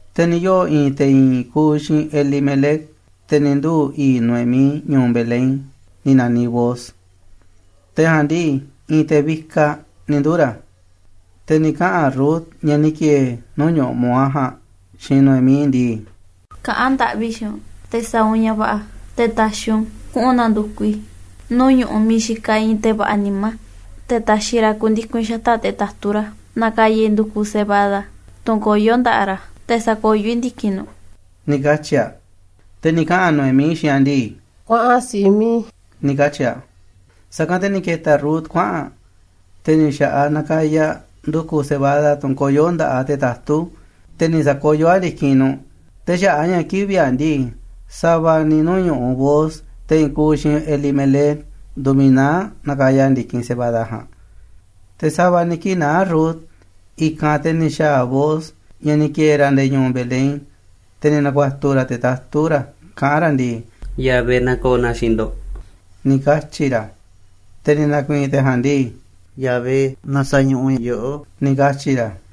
Te̱ ni̱ yoo̱ i̱i̱n te̱ i̱i̱n kuuꞌ xiinꞌ Elimelec, te̱ ni̱ nduu̱ i̱i̱ꞌ Noemí, ñu̱u̱ Belén, ni̱ na̱niꞌ Booz. Te̱ ja̱a̱nꞌ ndii, i̱i̱n te̱ vikaꞌ ni̱ nduu̱ ra̱. Te̱ ni̱ kaꞌa̱n Rut, ñaꞌ ni̱ ki̱e̱e̱ nuu̱ꞌ ñu̱ꞌuꞌ Moab ja̱a̱nꞌ, xiinꞌ Noemí ndii: ―Kaꞌán ndaꞌvi i̱ xiinꞌ u̱nꞌ te̱ sa̱a̱ u̱nꞌ ña̱ va̱ꞌa̱ te̱ ta̱xi̱ u̱nꞌ kuꞌu̱n na̱ndu̱kuꞌ i̱ nuu̱ꞌ ñu̱ꞌuꞌ miiꞌ xikaꞌ i̱i̱n te̱ va̱ꞌa̱ nimá, te̱ ta̱xi̱ ra̱ ku̱ndiku̱n i̱ xata̱ꞌ te̱ tatú ra̱ na̱ka̱ya̱ i̱ ndu̱ku̱ cebada, tunꞌ koyó nda̱ꞌaꞌ ra̱, te̱ sa̱koyó i̱ ndi̱kinꞌ nuꞌ ―ni̱ katyi̱ aꞌ. Te̱ ni̱ kaꞌa̱n Noemí xiinꞌ aꞌ ndii: ―Kuaꞌan, si̱ꞌiꞌ mi̱iꞌ i̱ ―ni̱ katyi̱ aꞌ. Sa̱kanꞌ te̱ ni̱ ke̱ta̱ Rut kuaꞌa̱n aꞌ, te̱ ni̱ xa̱ꞌaꞌ aꞌ nakaya aꞌ ndu̱ku̱ cebada, tunꞌ koyó nda̱ꞌaꞌ te̱ tatú, te̱ ni̱ sa̱koyó aꞌ ndi̱kinꞌ nuꞌ. Te̱ xaꞌa̱ꞌ a̱ ña̱ kivi̱ꞌ aꞌ ndii, sa̱va̱ ni̱ nuu̱ꞌ ñu̱ꞌuꞌ Booz, te̱ i̱i̱n kuuꞌ xiinꞌ ndii̱ Elimelec, nduuꞌ miiꞌ naá aꞌ nakaya aꞌ ndi̱kinꞌ cebada ja̱a̱nꞌ. Te̱ sa̱va̱ ni̱ kii̱ꞌ naá Rut i̱kanꞌ, te̱ ni̱ xa̱a̱ Booz, ña̱ ni̱ ki̱e̱e̱ ra̱ nde̱e̱ ñu̱u̱ Belén, te̱ ni̱ na̱ku̱a̱tu̱ ra̱ te̱ tatú ra̱ kaꞌán ra̱ ndii: ―Yahvé na̱ko̱o̱ na xiinꞌ ndo̱ꞌ ―ni̱ katyi̱ ra̱. Te̱ ni̱ na̱ku̱i̱i̱n te̱ ja̱a̱nꞌ ndii: ―Yahvé na sa̱ñuꞌuꞌ yoꞌó ―ni̱ katyi̱ ra̱.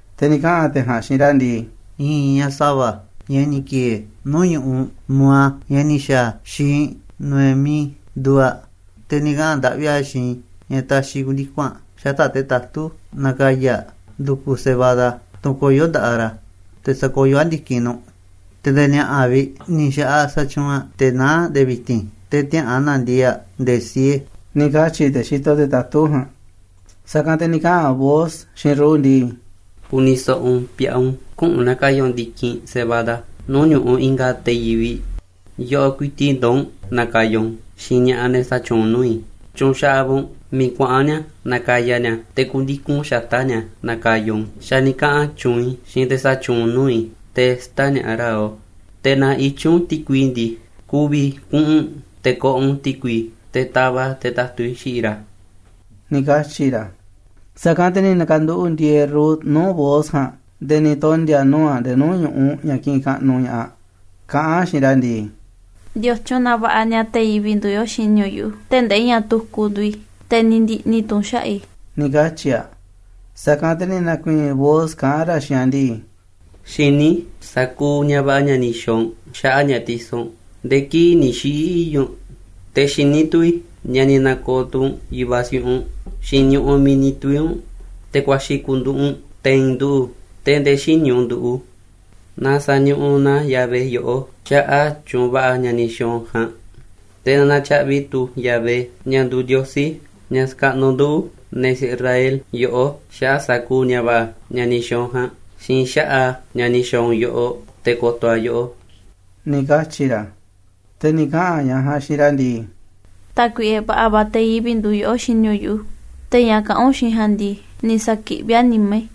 Te̱ ni̱ kaꞌa̱n te̱ ja̱a̱nꞌ xiinꞌ ra̱ ndii: ―I̱i̱n ñaꞌ sa̱va̱, ñaꞌ ni̱ ki̱e̱e̱ nuu̱ꞌ ñu̱ꞌuꞌ Moab, ñaꞌ ni̱ xa̱a̱ xiinꞌ Noemí, nduuꞌ aꞌ. Te̱ ni̱ kaꞌa̱n ndaꞌvi aꞌ xiinꞌ i̱ ña̱ ta̱xi̱ i̱ ku̱ndiku̱n aꞌ xata̱ꞌ te̱ tatú na̱ka̱ya̱ aꞌ ndu̱ku̱ cebada, tunꞌ koyó nda̱ꞌaꞌ ra̱, te̱ sa̱koyó aꞌ ndi̱kinꞌ nuꞌ. Te̱ nde̱e̱ ni̱a̱ꞌa̱ vi̱ꞌ ni̱ xa̱ꞌaꞌ aꞌ xatyuunꞌ aꞌ, te̱ naá aꞌ nde̱e̱ vi̱ti̱n, te̱ tiäꞌa̱an na̱ndiee̱ꞌ aꞌ nde̱e̱ siee ―ni̱ katyi̱ te̱ xitoꞌ te̱ tatú ja̱a̱nꞌ. Sa̱kanꞌ te̱ ni̱ kaꞌa̱n Booz xiinꞌ Rut ndii: ―Ku̱ni̱ so̱ꞌo̱ u̱nꞌ, pi̱a̱ꞌun. Küꞌu̱n na̱ka̱ya̱ u̱nꞌ ndi̱kinꞌ cebada nuu̱ꞌ ñu̱ꞌuꞌ i̱nga̱ te̱ yivi̱ꞌ. Yoꞌoꞌ ku̱i̱ti̱ꞌ ndoo̱ u̱nꞌ na̱ka̱ya̱ u̱nꞌ u̱n xiinꞌ ña̱ꞌaꞌ ne̱ xatyuunꞌ nuu̱ꞌ i̱. Tyu̱nxaꞌaꞌ va̱ u̱nꞌ miiꞌ kuaꞌa̱n ni̱a̱ nakaya ni̱a̱ a̱, te̱ ku̱ndiku̱n u̱nꞌ xata̱ꞌ ni̱a̱ na̱ka̱ya̱ u̱nꞌ u̱n. Xa̱ ni̱ kaꞌa̱n tyuunꞌ i̱ xiinꞌ te̱ xatyuunꞌ nuu̱ꞌ i̱ te̱ sä̱ta̱ñaꞌa̱ꞌ ra̱ yoꞌó. Te̱ naaꞌ i̱tyiꞌ u̱nꞌ ti̱kui ndii, ku̱vi̱ kuꞌu̱n u̱nꞌ te̱ ko̱ꞌo̱ u̱nꞌ ti̱kui, te̱ tava̱ꞌ te̱ tatú i̱ xiꞌiꞌ ra̱ ―ni̱ katyi̱ ra̱. Sa̱kanꞌ te̱ ni̱ na̱ka̱nduꞌu̱ꞌ ndi̱e̱e̱ Rut nuu̱ꞌ Booz ja̱a̱nꞌ, nde̱e̱ ni̱ tondi̱a̱ nuu̱ꞌ aꞌ nde̱e̱ nuu̱ꞌ ñu̱ꞌuꞌ ña̱ kiꞌinꞌ kaꞌnuꞌ ña̱ꞌaꞌ aꞌ kaꞌán aꞌ xiinꞌ ra̱ ndii: ―¿Ndiotyun na va̱ꞌa̱ ni̱a̱ te̱ yivi̱ꞌ nduuꞌ yoꞌó xini u̱nꞌ yuꞌu̱, tee̱ꞌ ndee ñaꞌ tukuꞌ nduuꞌ i̱, te̱ ni̱ ndi̱ꞌni̱ tu̱ u̱nꞌ xaꞌa̱ꞌ i̱? ―ni̱ katyi̱ aꞌ. Sa̱kanꞌ te̱ ni̱ na̱ku̱i̱i̱n Booz kaꞌán ra̱ xiinꞌ aꞌ ndii: ―Xiní i̱ sa̱kuuꞌ ña̱ va̱ꞌa̱ ña̱ ni̱ xa̱a̱ u̱nꞌ xaꞌa̱ꞌ ñaꞌ ti̱so̱ u̱nꞌ nde̱e̱ kii̱ꞌ ni̱ xiꞌi̱ i̱i̱ꞌ u̱nꞌ. Te̱ xiní tu̱ i̱ ña̱ ni̱ na̱ko̱o̱ tu̱ u̱nꞌ yu̱vaꞌ siꞌiꞌ u̱nꞌ xiinꞌ ñu̱ꞌuꞌ miiꞌ ni̱ tuvi̱ u̱nꞌ te̱ kuaxi̱ ku̱nduꞌu̱ꞌ u̱nꞌ te̱i̱n ndu̱ tee̱ꞌ ndee xïní u̱nꞌ ndu̱. Na sa̱ñuꞌuꞌ na Yahvé yoꞌó xaꞌa̱ꞌ tyu̱u̱n va̱ꞌa̱ ña̱ ni̱ xa̱a̱ u̱nꞌ ja̱a̱nꞌ. Te̱ na na̱tyaꞌvi̱ tu̱ Yahvé, ña̱ nduuꞌ Ndiosí, ña̱ xakaꞌnuꞌ nduꞌu̱, ne̱ Israel, yoꞌó xaꞌa̱ꞌ sa̱kuuꞌ ña̱ va̱ꞌa̱ ña̱ ni̱ xa̱a̱ u̱nꞌ ja̱a̱nꞌ, xiinꞌ xaꞌa̱ꞌ a̱ ña̱ ni̱ xa̱a̱ u̱nꞌ yoꞌoꞌ, te̱ ko̱to̱ a̱ yoꞌó ―ni̱ katyi̱ ra̱. Te̱ ni̱ kaꞌa̱n ñaꞌ ja̱a̱nꞌ xiinꞌ ra̱ ndii: ―Tákuiꞌe, va̱ꞌa̱ va̱ te̱ yivi̱ꞌ nduuꞌ yoꞌó xini u̱nꞌ yuꞌu̱, te̱ ña̱ kaꞌán u̱nꞌ xiinꞌ i̱ ja̱a̱nꞌ ndii, ni̱ sa̱kiꞌví a̱ nimá i̱,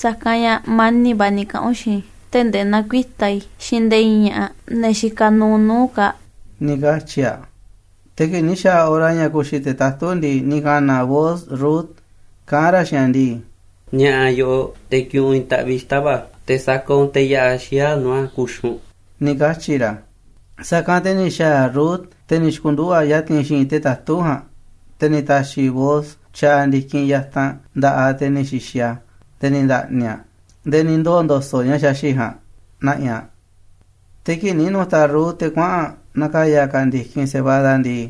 sa̱kanꞌ ña̱ mani̱ꞌ va̱ ni̱ kaꞌa̱n u̱nꞌ xiinꞌ i̱ tee̱ꞌ ndee näkuitá i̱ xiinꞌ nde̱e̱ i̱i̱n ña̱ꞌaꞌ, ne̱ xikaꞌ nuuꞌ nuu̱ꞌ u̱nꞌ kaa̱ꞌ ―ni̱ katyi̱ aꞌ. Te̱ kii̱ꞌ ni̱ xa̱a̱ hora ña̱ ku̱xi̱ te̱ tatú ndii, ni̱ ka̱na̱ Booz Rut kaꞌánꞌ ra̱ xiinꞌ aꞌ ndii: ―Ni̱a̱ꞌa̱ yoꞌoꞌ te̱ ki̱ꞌi̱n u̱nꞌ i̱i̱n taꞌviꞌ xita̱ꞌ va̱ꞌa̱, te̱ sa̱ka̱ꞌ u̱nꞌ teꞌ ya̱ꞌaꞌ xiyáꞌ nuu̱ꞌ a̱ ku̱xi̱ u̱nꞌ ―ni̱ katyi̱ ra̱. Sa̱kanꞌ te̱ ni̱ xa̱a̱ Rut, te̱ ni̱ xi̱ku̱nduꞌu̱ꞌ aꞌ ya̱ti̱n xi̱i̱nꞌ te̱ tatú ja̱a̱nꞌ. Te̱ ni̱ ta̱xi̱ Booz tyaaꞌ ndi̱kinꞌ yatanꞌ nda̱ꞌaꞌ aꞌ, te̱ ni̱ xi̱xi̱ aꞌ nde̱e̱ ni̱ nda̱ꞌni̱ aꞌ, nde̱e̱ ni̱ ndoo̱ ndo̱so̱ꞌ ña̱ xaxi̱ꞌ ja̱a̱nꞌ na̱ꞌi̱ aꞌ. Te̱ kii̱ꞌ ni̱ nu̱ta̱ Rut te̱ kuaꞌa̱n na̱ka̱ya̱ ka̱ aꞌ ndi̱kinꞌ cebada ndii,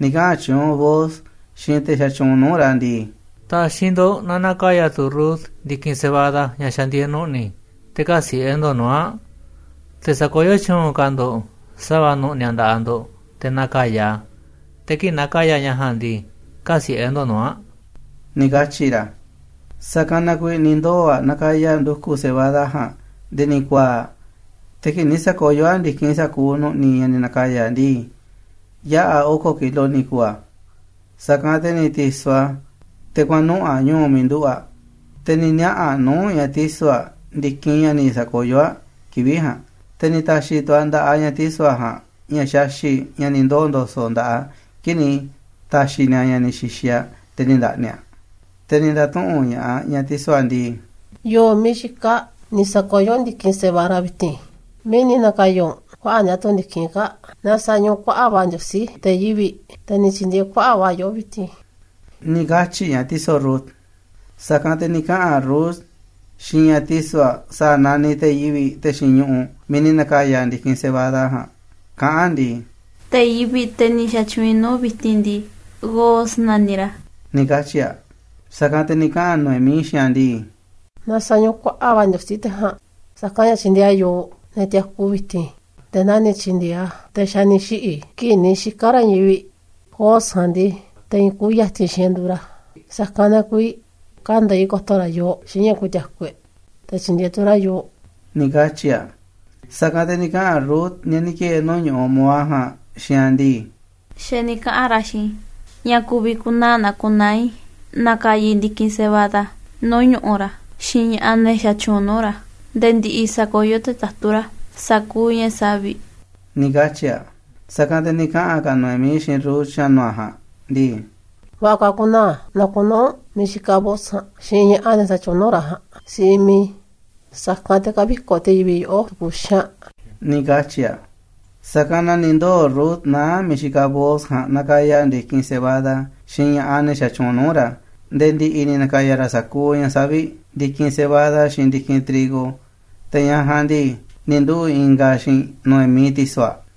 ni̱ kaꞌa̱n tyuunꞌ Booz xiinꞌ te̱ xatyuunꞌ nuu̱ꞌ ra̱ ndii: ―Ta̱xi̱ ndo̱ꞌ na na̱ka̱ya̱ tu̱ Rut ndi̱kinꞌ cebada ña̱ xa̱ ndieeꞌ nu̱ꞌni̱, te̱ kä̱siꞌe̱ ndo̱ꞌ nuu̱ꞌ aꞌ. Te̱ sa̱koyó tyu̱u̱n ka̱ ndo̱ꞌ sa̱va̱ nu̱ꞌni̱ a̱ nda̱ꞌaꞌ ndo̱ꞌ te̱ na̱ka̱ya̱ aꞌ, te̱ kii̱ꞌ nakaya aꞌ ña̱ ja̱a̱nꞌ ndii, kä̱siꞌe̱ ndo̱ꞌ nuu̱ꞌ aꞌ ―ni̱ katyi̱ ra̱. Sa̱kanꞌ na kuiiꞌ ni̱ ndoo̱ aꞌ nakaya aꞌ ndu̱ku̱ cebada ja̱a̱nꞌ nde̱e̱ ni̱ ku̱a̱a̱ꞌ, te̱ kii̱ꞌ ni̱ sa̱koyó aꞌ ndi̱kinꞌ sa̱kuuꞌ nu̱ꞌni̱ ña̱ ni̱ na̱ka̱ya̱ aꞌ ndii, yaꞌa̱ oko̱ kilo ni̱ ku̱u̱ a̱. Sa̱kanꞌ te̱ ni̱ ti̱so̱ aꞌ te̱ kuaꞌa̱n nuꞌu̱ꞌ aꞌ ñu̱u̱ miiꞌ nduꞌu̱ꞌ aꞌ, te̱ ni̱ niaꞌa̱ aꞌ nuu̱ꞌ ñaꞌ ti̱so̱ aꞌ ndi̱kinꞌ ña̱ ni̱ sa̱koyó aꞌ kivi̱ꞌ ja̱a̱nꞌ. Te̱ ni̱ ta̱xi̱ tu̱ aꞌ nda̱ꞌaꞌ ñaꞌ ti̱so̱ aꞌ ja̱a̱nꞌ ña̱ xaxi̱ꞌ, ña̱ ni̱ ndoo̱ ndo̱so̱ꞌ nda̱ꞌaꞌ aꞌ kii̱ꞌ ni̱ ta̱xi̱ ni̱a̱ ña̱ ni̱ xi̱xi̱ aꞌ nde̱e̱ ni̱ nda̱ꞌni̱ aꞌ. Te̱ ni̱ nda̱tuꞌu̱nꞌ ña̱ꞌaꞌ ñaꞌ ti̱so̱ aꞌ ndii: ―¿Yo̱o̱ miiꞌ xikaꞌ ni̱ sa̱koyó u̱nꞌ ndi̱kinꞌ cebada vi̱ti̱n? ¿Miiꞌ ni̱ na̱ka̱ya̱ u̱nꞌ kuaꞌa̱ꞌ ni̱a̱ tu̱ ndi̱kinꞌ kaa̱ꞌ? Na sa̱ñuꞌuꞌ kuaꞌa̱ꞌ va̱ Ndiosí te̱ yivi̱ꞌ, te̱ ni̱ tyi̱ndi̱e̱eꞌ kuaꞌa̱ꞌ va̱ yoꞌó vi̱ti̱n ―ni̱ katyi̱ ñaꞌ ti̱so̱ Rut. Sa̱kanꞌ te̱ ni̱ kaꞌa̱n Rut xiinꞌ ñaꞌ ti̱so̱ aꞌ sa̱a̱ naniꞌ te̱ yivi̱ꞌ, te̱ xiinꞌ ñu̱ꞌuꞌ miiꞌ ni̱ na̱ka̱ya̱ ndi̱kinꞌ cebada ja̱a̱nꞌ, kaꞌán aꞌ ndii: ―Te̱ yivi̱ꞌ, te̱ ni̱ xa̱tyuunꞌ i̱ nuu̱ꞌ vi̱ti̱n ndii, Booz naniꞌ ra̱ ―ni̱ katyi̱ aꞌ. Sa̱kanꞌ te̱ ni̱ kaꞌa̱n Noemí xiinꞌ aꞌ ndii: ―Na sa̱ñuꞌuꞌ kuaꞌa̱ꞌ va̱ Ndiosí te̱ ja̱a̱nꞌ. Sa̱kanꞌ ña̱ tyindieeꞌ a̱ yooꞌ, ne̱ tiaku vi̱ti̱n, nde̱e̱ naa ni̱ tyi̱ndi̱e̱eꞌ a̱ te̱ xa̱ ni̱ xiꞌi̱ kii̱ꞌ ni̱ xika̱ ra̱ i̱i̱n yivi̱ꞌ. Booz ja̱a̱nꞌ ndii, te̱ i̱i̱n kuuꞌ ya̱ti̱n xiinꞌ e̱ꞌ nduuꞌ ra̱, sa̱kanꞌ na kuiiꞌ kande̱iꞌ ko̱to̱ ra̱ yooꞌ xiinꞌ ña̱ ku̱ti̱a̱ku̱ e̱ꞌ, te̱ tyi̱ndi̱e̱eꞌ tu̱ ra̱ yooꞌ ―ni̱ katyi̱ aꞌ. Sa̱kanꞌ te̱ ni̱ kaꞌa̱n Rut, ñaꞌ ni̱ ki̱e̱e̱ nuu̱ꞌ ñu̱ꞌuꞌ Moab ja̱a̱nꞌ, xiinꞌ aꞌ ndii: ―Xa̱ ni̱ kaꞌa̱n ra̱ xiinꞌ i̱ ña̱ ku̱vi̱ ku̱naa̱ naa ku̱naa̱ i̱ na̱ka̱ya̱ i̱ ndi̱kinꞌ cebada nuu̱ꞌ ñu̱ꞌuꞌ ra̱ xiinꞌ ña̱ꞌaꞌ, ne̱ xatyuunꞌ nuu̱ꞌ ra̱, nde̱e̱ ndi̱ꞌi̱ sa̱koyó te̱ tatú ra̱ sa̱kuuꞌ ña̱ savi̱ꞌ ―ni̱ katyi̱ aꞌ. Sa̱kanꞌ te̱ ni̱ kaꞌa̱n ka̱ Noemí xiinꞌ Rut, xa̱nu̱ aꞌ ja̱a̱nꞌ, ndii: ―Va̱ꞌa̱ ka̱ ku̱naa̱ naa ku̱naa̱ u̱nꞌ miiꞌ xikaꞌ Booz ja̱a̱nꞌ xiinꞌ ña̱ꞌaꞌ, ne̱ xatyuunꞌ nuu̱ꞌ ra̱ ja̱a̱nꞌ, si̱ꞌiꞌ miiꞌ i̱, sa̱kanꞌ te̱ kä̱vi̱koꞌ te̱ yivi̱ꞌ yoꞌó tu̱ku̱ xaanꞌ ―ni̱ katyi̱ aꞌ. Sa̱kanꞌ na ni̱ ndoo̱ Rut naá aꞌ miiꞌ xikaꞌ Booz ja̱a̱nꞌ nakaya aꞌ ndi̱kinꞌ cebada xiinꞌ ña̱ꞌaꞌ, ne̱ xatyuunꞌ nuu̱ꞌ ra̱, nde̱e̱ ndi̱ꞌi̱ ni̱ na̱ka̱ya̱ ra̱ sa̱kuuꞌ ña̱ savi̱ꞌ, ndi̱kinꞌ cebada xiinꞌ ndi̱kinꞌ trigo. Te̱ ñaꞌ ja̱a̱nꞌ ndii, ni̱ nduꞌu̱ꞌ ingaꞌ aꞌ xiinꞌ Noemí, ti̱so̱ aꞌ.